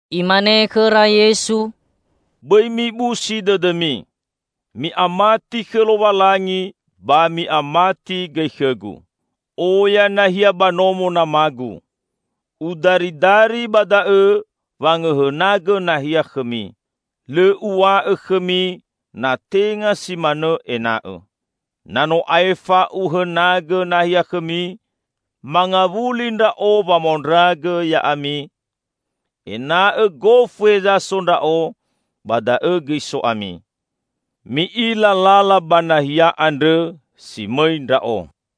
Imane khõra Yesu, "Bõi mibusi dõdõmi. Mi'amati khõ Lowalangi, ba mi'amati gõi khõ-Gu. Oya nahia ba nomo Nama-Gu. Udaridari ba da'õ wangõhõnagõ nahia khõmi. Lõ Uw̃a'õ khõmi natenga si manõ ena'õ. Na no aefa Uhenagõ nahia khõmi, mangawuli Ndra'o wamaondragõ ya'ami; ena'õ gofu heza so Ndra'o ba da'õ gõi so ami. Mi'ila lala ba nahia andrõ si mõi Ndra'o."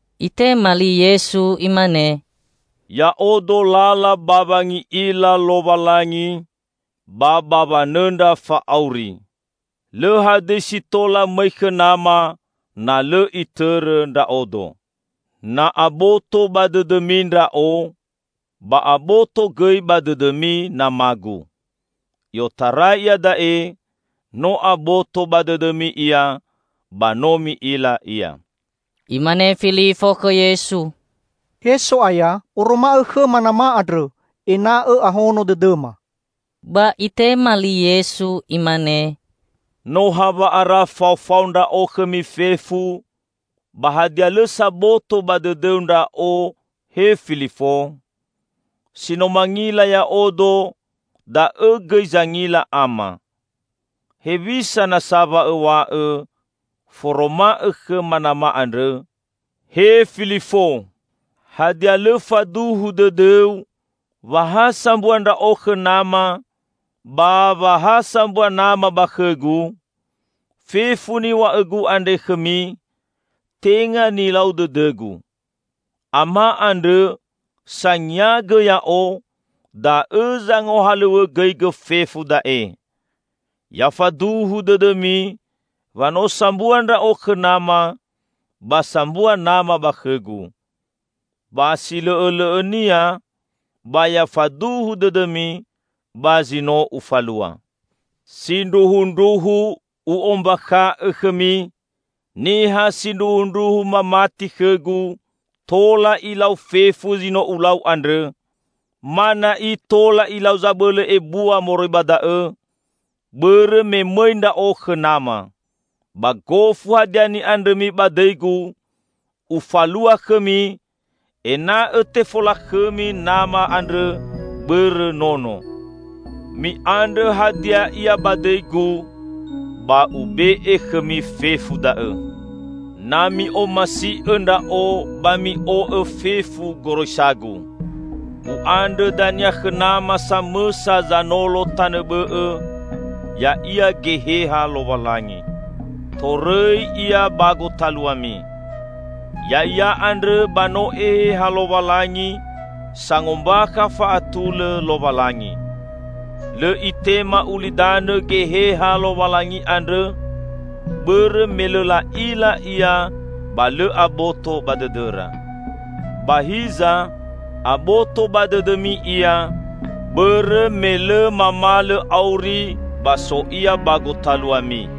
Itema li Yesu Imane, "Ya'odo lala ba wangi'ila Lowalangi, ba ba wanõndra fa'auri. Lõ hadõi si tola mõi khõ Nama na lõ itõrõ Ndra'odo. Na aboto ba dõdõmi Ndra'o, ba aboto gõi ba dõdõmi Nama-Gu. I'otarai iada'e no aboto ba dõdõmi Ia, ba no mi'ila Ia." Imane Filifo khõ Yesu, "He So'aya, oroma'õ khõma Nama andrõ, ena'õ ahono dõdõma." Ba itema li Yesu Imane, "No hawa'ara faofao Ndra'o khõmi fefu, ba hadia lõ saboto ba dõdõu Ndra'o, he Filifo? Si no mangila Ya'odo, da'õ gõi zangila Ama. Hewisa nasa wa õw̃a'õ, 'Foroma'õ khõma Nama andrõ?' He Filifo! Hadia lõ faduhu dõdõu, wa ha sambua Ndra'o khõ Nama, ba wa ha sambua Nama ba khõ-Gu? Fefu niw̃a'õ-Gu andre khõmi, tenga nilau dõdõ-Gu. Ama andrõ, sangiangõ Ya'o, da'õ zangohalõw̃õgõigõ fefu da'e. Ya faduhu dõdõmi wa no sambua Ndra'o khõ Nama, ba sambua Nama ba khõ-Gu. Ba silõ'õlõ'õnia ba ya faduhu dõdõmi ba zi no Ufalua. Sindruhundruhu U'ombakha'õ khõmi: Niha sindruhundruhu mamati khõ-Gu, tola ilau fefu zi no Ulau andrõ, -- ma na'i tola ilau zabõlõ ebua moroi ba da'õ -- bõrõ me mõi Ndra'o khõ Nama. Ba gofu hadia ni'andrõmi ba dõi-Gu, Ufalua khõmi, ena'õ tefolakhõmi Nama andrõ bõrõ Nono. Mi'andrõ hadia ia ba dõi-Gu; ba Ube'e khõmi fefu da'õ." "Na mi'omasi'õ Ndra'o, ba mi'o'õ fefu goroisa-Gu. U'andrõ dania khõ Nama samõsa Zanolo tanõ bõ'õ, ya'ia Geheha Lowalangi. Torõi Ia ba gotaluami. Ya'ia andrõ ba no Eheha Lowalangi, sangombakha fa'atulõ Lowalangi. Lõ itema ulidanõ Geheha Lowalangi andrõ, bõrõ me lõ la'ila Ia ba lõ aboto ba dõdõra. Ba hiza, aboto ba dõdõmi Ia, bõrõ me lõ mamalõ auri ba so Ia ba gotaluami.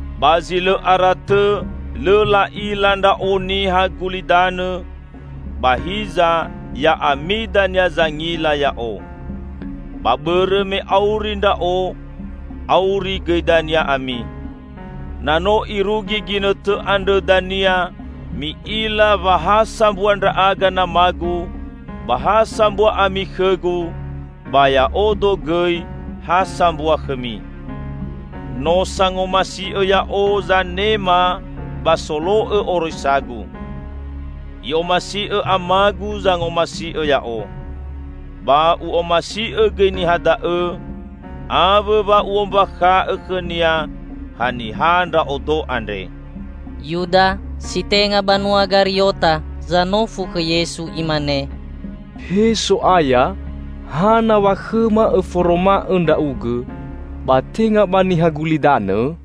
Ba zi lõ ara tõ lõ la'ila Ndra'o niha gulidanõ, ba hiza ya'ami dania zangila Ya'o; ba bõrõ me auri Ndra'o, auri gõi dania ami. Na no irugi ginõtõ andrõ dania mi'ila wa ha sambua Ndra'aga Nama-Gu, ba ha sambua ami khõ-Gu, ba Ya'odo gõi ha sambua khõmi. No sangomasi'õ Ya'o zanema ba solo'õ oroisa-Gu. I'omasi'õ Amagu zangomasi'õ Ya'o. Ba U'omasi'õ gõi niha da'õ, awõ wa U'ombakha'õ khõnia haniha Ndra'odo andre." Yuda (si tenga banua Gariota) zanofu khõ Yesu imane, "He So'aya, hana wa khõma Õforoma'õ Ndra'ugõ ba tenga ba niha gulidanõ?"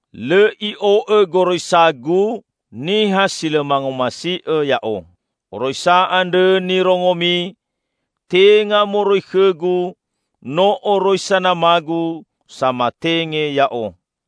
Lõ i'o'õ goroisa-Gu niha si lõ mangomasi'õ Ya'o. Oroisa andrõ nirongomi tenga moroi khõ-Gu, no oroisa Nama-Gu, samatenge Ya'o.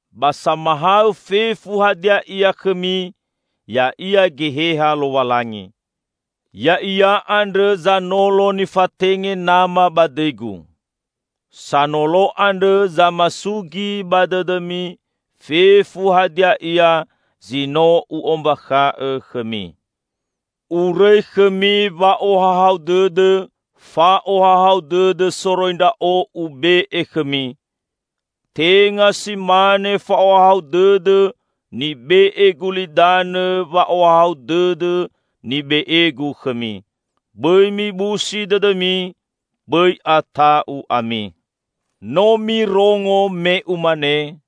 Ba samahaõ fefu hadia ia khõmi ya'ia Geheha Lowalangi. Ya'ia andrõ Zanolo nifatenge Nama ba dõi-Gu. Sanolo andrõ zamasugi ba dõdõmi fefu hadia ia zi no U'ombakha'õ khõmi. Urõi khõmi wa'ohahau dõdõ. Fa'ohahau dõdõ soroi Ndra'o Ube'e khõmi. Tenga si mane fa'ohahau dõdõ nibe'e gulidanõ wa'ohahau dõdõ nibe'e-Gu khõmi. Bõi mibusi dõdõmi; bõi ata'u ami. No mirongo me Umane,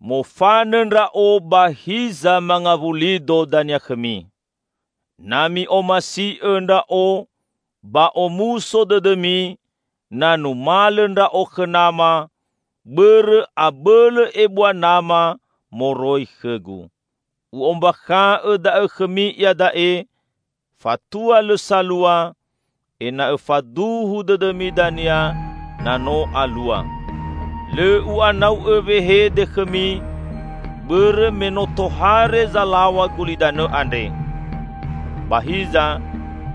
'Mofanõ Ndra'o ba hiza mangawuli-Do dania khõmi.' Na mi'omasi'õ Ndra'o, ba omuso dõdõmi na numalõ Ndra'o khõ Nama, bõrõ abõlõ ebua Nama moroi khõ-Gu. U'ombakha'õ da'õ khõmi iada'e, fatua lõ salua, ena'õ faduhu dõdõmi dania na no alua. Lõ U'anau'õ wehede khõmi, bõrõ me no tohare zalaw̃a gulidanõ andre. Ba hiza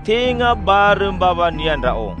tenga barõ mbawania Ndra'o.